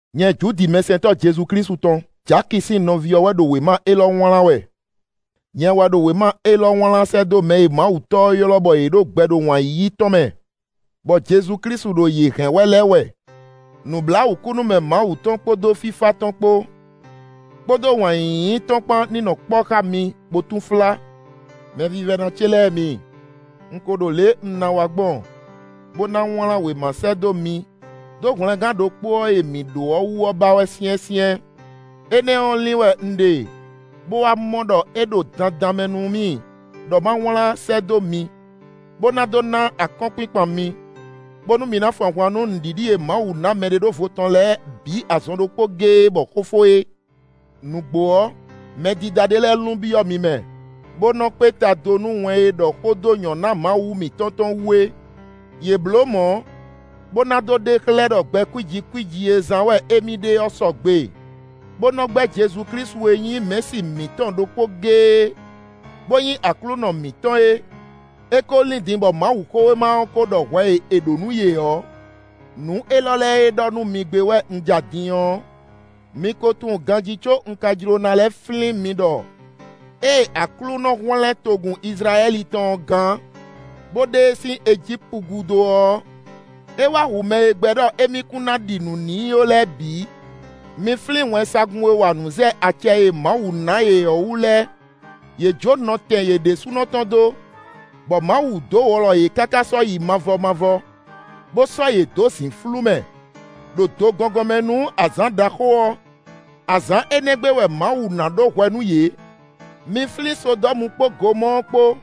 Nyɛ Judi mɛsɛntɔ́ Jezu Klísu tɔn, Jaki sín nɔví ɔ́ wɛ ɖo wěma élɔ́ wlán wɛ; nyɛ wɛ ɖo wěma élɔ́ wlán sɛ́ dó mɛ e Mawu Tɔ́ ɔ́ ylɔ́ bɔ yě ɖo gbɛ ɖo wǎn yíyí tɔn mɛ, bɔ Jezu Klísu ɖo yě hɛn wɛ lɛ́ɛ wɛ. Nǔbláwǔkúnúmɛ Mawu tɔn kpódó fífá tɔn kpó, kpódó wǎn yíyí tɔn kpán ní nɔ kpɔ́ xá mi bó túnflá. Mɛvívɛ́ná ce lɛ́ɛ mi, un ko ɖo lě e un ná wa gbɔn, bó ná wlán wěma sɛ́ dó mi dó hwlɛngán ɖokpó ɔ́ e mǐ ɖó ɔ́ wú ɔ́ ba wɛ syɛ́nsyɛ́n; énɛ́ ɔ́ lin wɛ un ɖe bó wá mɔ ɖɔ é ɖo dandan mɛ nú mì ɖɔ ma wlán sɛ́ dó mi, bó ná dó ná akɔ́nkpinkpan mi, bónú mi ná fun ahwan nú nǔɖiɖi e Mawu ná mɛɖeɖóvo tɔn lɛ́ɛ bǐ azɔn ɖokpó géé bɔ xó fó é. Nǔgbó ɔ́, mɛdídá ɖé lɛ́ɛ lun byɔ́ mi mɛ, bó nɔ́ kpé ta do nú wɛn e ɖɔ xó dó nyɔ̌ná Mawu mǐtɔn tɔn wú é; yě bló mɔ̌, bó ná dó ɖe xlɛ́ ɖɔ gbɛ kwíji kwíji e zán wɛ émí ɖe ɔ́ sɔgbe, bó nɔ́ gbɛ́ Jezu Klísu e nyí Mɛ̌si mǐtɔn ɖokpó géé, bó nyí Aklúnɔ mǐtɔn é. É ko lín din bɔ Mawuxówéma ɔ́ ko ɖɔ hwɛ e è ɖǒ nú yě ɔ́. Nǔ élɔ́ lɛ́ɛ e ɖɔ nú mi gbé wɛ un ja din ɔ́, mi ko tunwun ganjí có un ka jló ná lɛ́ flín mi ɖɔ ée Aklúnɔ hwlɛ́n togun Izlayɛ́li tɔn ɔ́ gán, bó ɖe e sín Ejípu gúdo ɔ́, é wá hu mɛ e gbɛ́ ɖɔ émí kún ná ɖi nǔ n'i ó lɛ́ɛ bǐ. Mi flín wɛnsagun e wa nǔ zɛ acɛ e Mawu ná yě ɔ́ wú lɛ́ɛ; yě jó nɔtɛn yě ɖésúnɔ tɔn dó, bɔ Mawu dó wlɔ yě káká sɔ́yi mavɔ mavɔ, bó sɔ́ yě dó zǐnflú mɛ, ɖo do gɔngɔn mɛ nú azǎn ɖaxó ɔ́; azǎn énɛ́ gbe wɛ Mawu ná ɖó hwɛ nú yě. Mi flín Sodɔ́mu kpó Gomɔ́ɔ kpó,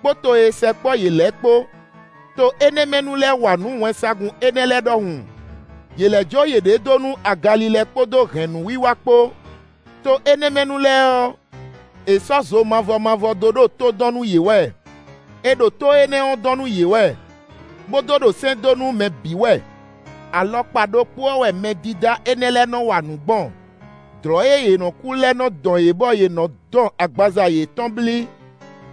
kpódó to e sɛkpɔ́ yě lɛ́ɛ kpó; to énɛ́ mɛ nu lɛ́ɛ wa nǔ wɛnsagun énɛ́ lɛ́ɛ ɖɔhun; yě lɛ́ jó yěɖée dó nú agalilɛ kpódó hɛ̌nnú wiwa kpó; to énɛ́ mɛ nu lɛ́ɛ ɔ́, è sɔ́ zo mavɔ mavɔ dó ɖo tó dɔn nú yě wɛ; è ɖo tó énɛ́ ɔ́ dɔn nú yě wɛ, bó dó ɖo sɛ́n dó nú mɛ bǐ wɛ. Alɔkpa ɖokpó ɔ́ wɛ mɛdídá énɛ́ lɛ́ɛ nɔ wa nǔ gbɔn: dlɔ̌ e yě nɔ́ kú lɛ́ɛ nɔ́ dɔn yě bɔ yě nɔ dɔn agbaza yětɔn blí;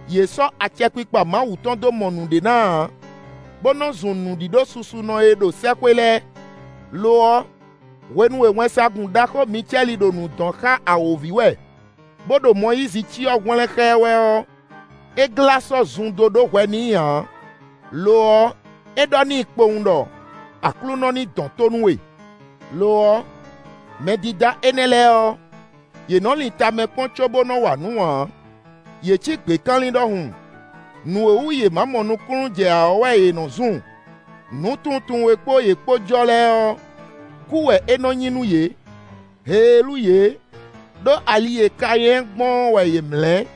yě sɔ́ acɛkpikpa Mawu tɔn dó mɔ nǔɖé ná ǎ, bó nɔ́ zun nǔɖíɖó susunɔ e ɖo sɛ́xwé lɛ́ɛ. Lo ɔ́, hwenu e wɛnsagun ɖaxó Micɛ́li ɖo nǔ dɔn xá awǒvi wɛ, bó ɖo Mɔyízi cyɔ hwlɛ́n xá ɛ wɛ ɔ́, é glá sɔ́ zun dó ɖó hwɛ n'i ǎ; lo ɔ́, é ɖɔ n'i kpowun ɖɔ: “Aklúnɔ ní dɔn tó nú we.” Lo ɔ́, mɛdídá énɛ́ lɛ́ɛ ɔ́, yě nɔ lin tamɛ kpɔ́n cóbó nɔ wa nǔ ǎ. Yě cí gběkanlin ɖɔhun; nǔ e wú yě ma mɔ nukúnnú jɛ ǎ ɔ́ wɛ yě nɔ zun; nǔtunwuntunwun e kpó yě kpó jɔ lɛ́ɛ ɔ́, kú wɛ é nɔ nyí nú yě. Heelú yě, ɖó ali e Kanyɛ́ɛ gbɔn ɔ́ wɛ yě mlɛ́.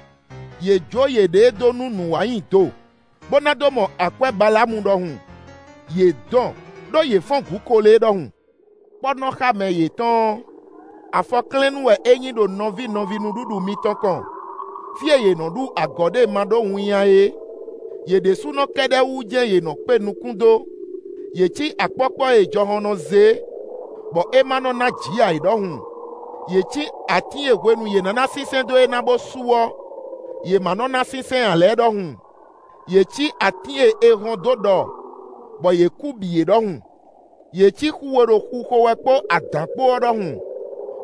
Yě jó yěɖée dó nú nǔ wa nyi do, bó ná dó mɔ akwɛ́ Baláamu ɖɔhun. Yě dɔn, ɖó yě fɔ́n gǔ Kolée ɖɔhun. Kpɔ́nɔxámɛ yětɔn ɔ́, afɔklɛ́nnú wɛ é nyí ɖo nɔví nɔví nǔɖuɖu mitɔn kɔn, fí e yě nɔ ɖu agɔ̌ ɖe ma ɖó winnyá é. Yě ɖésúnɔ kɛ́ɖɛ́ wú jɛ́n yě nɔ kpé nukún dó. Yě cí akpɔ́kpɔ́ e jɔhɔn nɔ zé, bɔ é ma nɔ ná jǐ ǎ é ɖɔhun. Yě cí atín e hwenu yě ná ná sínsɛ́n dó é ná bó su ɔ́, yě ma nɔ ná sínsɛ́n ǎ lɛ́ɛ ɖɔhun. Yě cí atín e è hɔn dó ɖɔ, bɔ yě kú bǐ é ɖɔhun. Yě cí xu e ɖo xixo wɛ kpó adǎn kpó ɔ́ ɖɔhun,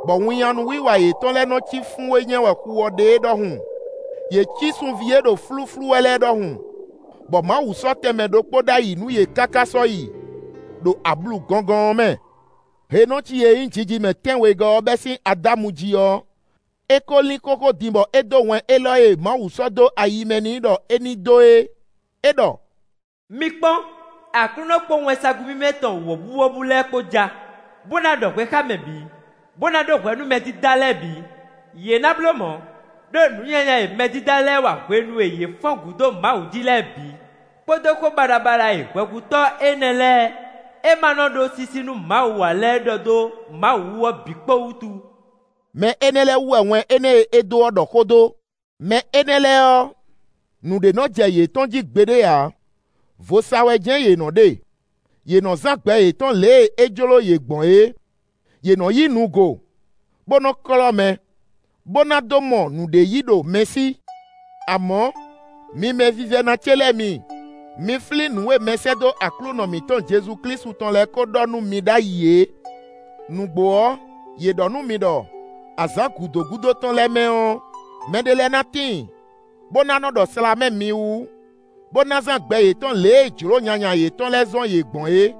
bɔ winnyánú wiwa yětɔn lɛ́ɛ nɔ cí fún e nyɛ wɛ xu ɔ́ ɖe é ɖɔhun. Yě cí sunví e ɖo flúflú wɛ lɛ́ɛ ɖɔhun, bɔ Mawu sɔ́ tɛnmɛ ɖokpó ɖ'ayǐ nú yě káká sɔ́yi, ɖo ablu gɔngɔn ɔ́ mɛ. Henɔci e nyí jijimɛ tɛ́nwegɔ́ ɔ́ bɛ́ sín Adámu jí ɔ́, é ko lín xóxó din bɔ é dó wɛn élɔ́ e Mawu sɔ́ dó ayi mɛ n'i ɖɔ é ní dó e; é ɖɔ: “Mi kpɔ́n! Aklúnɔ kpó wɛnsagun mímɛ́ tɔn wɔ̌buwɔ́bú lɛ́ɛ kpó ja, bó ná ɖɔ hwɛ xá mɛ bǐ, bó ná ɖó hwɛ nú mɛdídá lɛ́ɛ bǐ; yě ná bló mɔ̌, ɖó nǔ nyanya e mɛdídá lɛ́ɛ wa hwenu e yě fɔ́n gǔ dó Mawu jí lɛ́ɛ bǐ, kpódó xó baɖabaɖa e hwɛhutɔ́ énɛ́ lɛ́ɛ e ma nɔ ɖó sísí nú Mawu ǎ lɛ́ɛ ɖɔ dó Mawu wú ɔ́ bǐ kpó wútu”. Mɛ énɛ́ lɛ́ɛ wú wɛ wɛn énɛ́ e é dó ɔ́ ɖɔ xó dó. Mɛ énɛ́ lɛ́ɛ ɔ́, nǔɖé nɔ jɛ yětɔn jí gbeɖé ǎ; vo sa wɛ jɛ́n yě nɔ ɖe; yě nɔ zán gbɛ yětɔn lě e é jló yě gbɔn é; yě nɔ yí nu go, bó nɔ klɔ́ mɛ, bó ná dó mɔ nǔɖé yí ɖo mɛ sí. Amɔ̌, mi mɛvívɛ́ná ce lɛ́ɛ mi, mi flín nǔ e mɛsɛ́dó Aklúnɔ mǐtɔn Jezu Klísu tɔn lɛ́ɛ ko ɖɔ nú mi ɖ'ayǐ é. Nǔgbó ɔ́, yě ɖɔ nú mi ɖɔ: “Azǎn gǔdo gúdo tɔn lɛ́ɛ mɛ ɔ́, mɛɖé lɛ́ɛ ná tíin, bó ná nɔ ɖɔ slǎmɛ mi wú, bó ná zán gbɛ yětɔn lě e jlǒ nyanya yětɔn lɛ́ɛ zɔ́n yě gbɔn é.”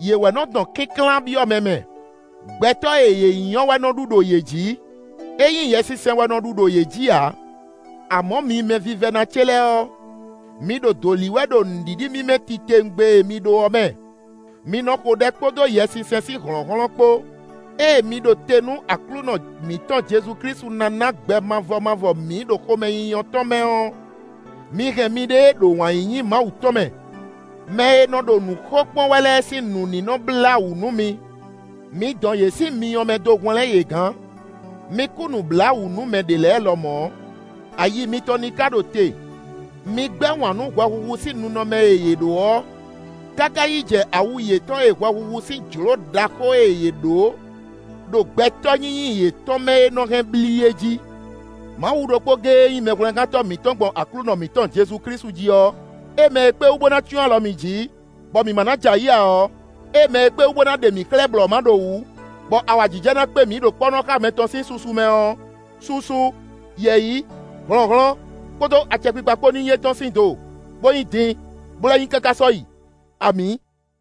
Yě wɛ nɔ dɔn kínklán byɔ́ mɛ mɛ. Gbɛtɔ́ e yě nyí ɔ́ wɛ nɔ ɖu ɖo yě jǐ; é nyí Yɛsinsɛn wɛ nɔ ɖu ɖo yě jí ǎ. Amɔ̌ mi mɛvívɛ́ná ce lɛ́ɛ ɔ́, mi ɖo dǒ lí wɛ ɖo nǔɖiɖi mímɛ́ titewungbe e mi ɖó ɔ́ mɛ; mi nɔ xo ɖɛ kpódó Yɛsinsɛn sín hlɔ̌nhlɔ́n kpó, ée mi ɖo te nú Aklúnɔ mǐtɔn Jezu Klísu ná ná gbɛ mavɔ mavɔ mi ɖo xomɛnyínyɔ́ tɔn mɛ ɔ́, mi hɛn miɖée ɖo wǎn yíyí Mawu tɔn mɛ. Mɛ e nɔ ɖo nǔ xo kpɔ́n wɛ lɛ́ɛ sín nǔ ní nɔ blá wǔ nú mi. Mi dɔn yě sín myɔ mɛ dó hwlɛ́n yě gán. Mi kú nǔbláwǔ nú mɛ ɖě lɛ́ɛ lɔmɔ̌; ayi mitɔn ní ka ɖo te; mi gbɛ́ wǎn nú hwɛhuhu sín ninɔmɛ e yě ɖó ɔ́ káká yi jɛ awu yětɔn e hwɛhuhu sín jlǒ ɖaxó e yě ɖǒ ɖo gbɛtɔ́ nyínyí yětɔn mɛ é nɔ́ hɛn blí é jí. Mawu ɖokpó géé e nyí Mɛhwlɛ́ngántɔ́ mǐtɔn gbɔn Aklúnɔ mǐtɔn Jezu Klísu jí ɔ́, é mɛ e kpé wú bó ná cyɔ́n alɔ mi jí, bɔ mi ma ná jɛ ayǐ ǎ ɔ́, é mɛ e kpé wú bó ná ɖe mi xlɛ́ blɔ̌máɖowǔ, bɔ awǎjijɛ ná kpé mi ɖo kpɔ́nɔxámɛ tɔn sín susu mɛ ɔ́, susu, yɛ̌yi, hlɔ̌nhlɔ́n kpódó acɛkpikpa kpó nyí étɔn sín do, bó nyí din, bó lɛ́ nyí káká sɔ́yi. Amǐ.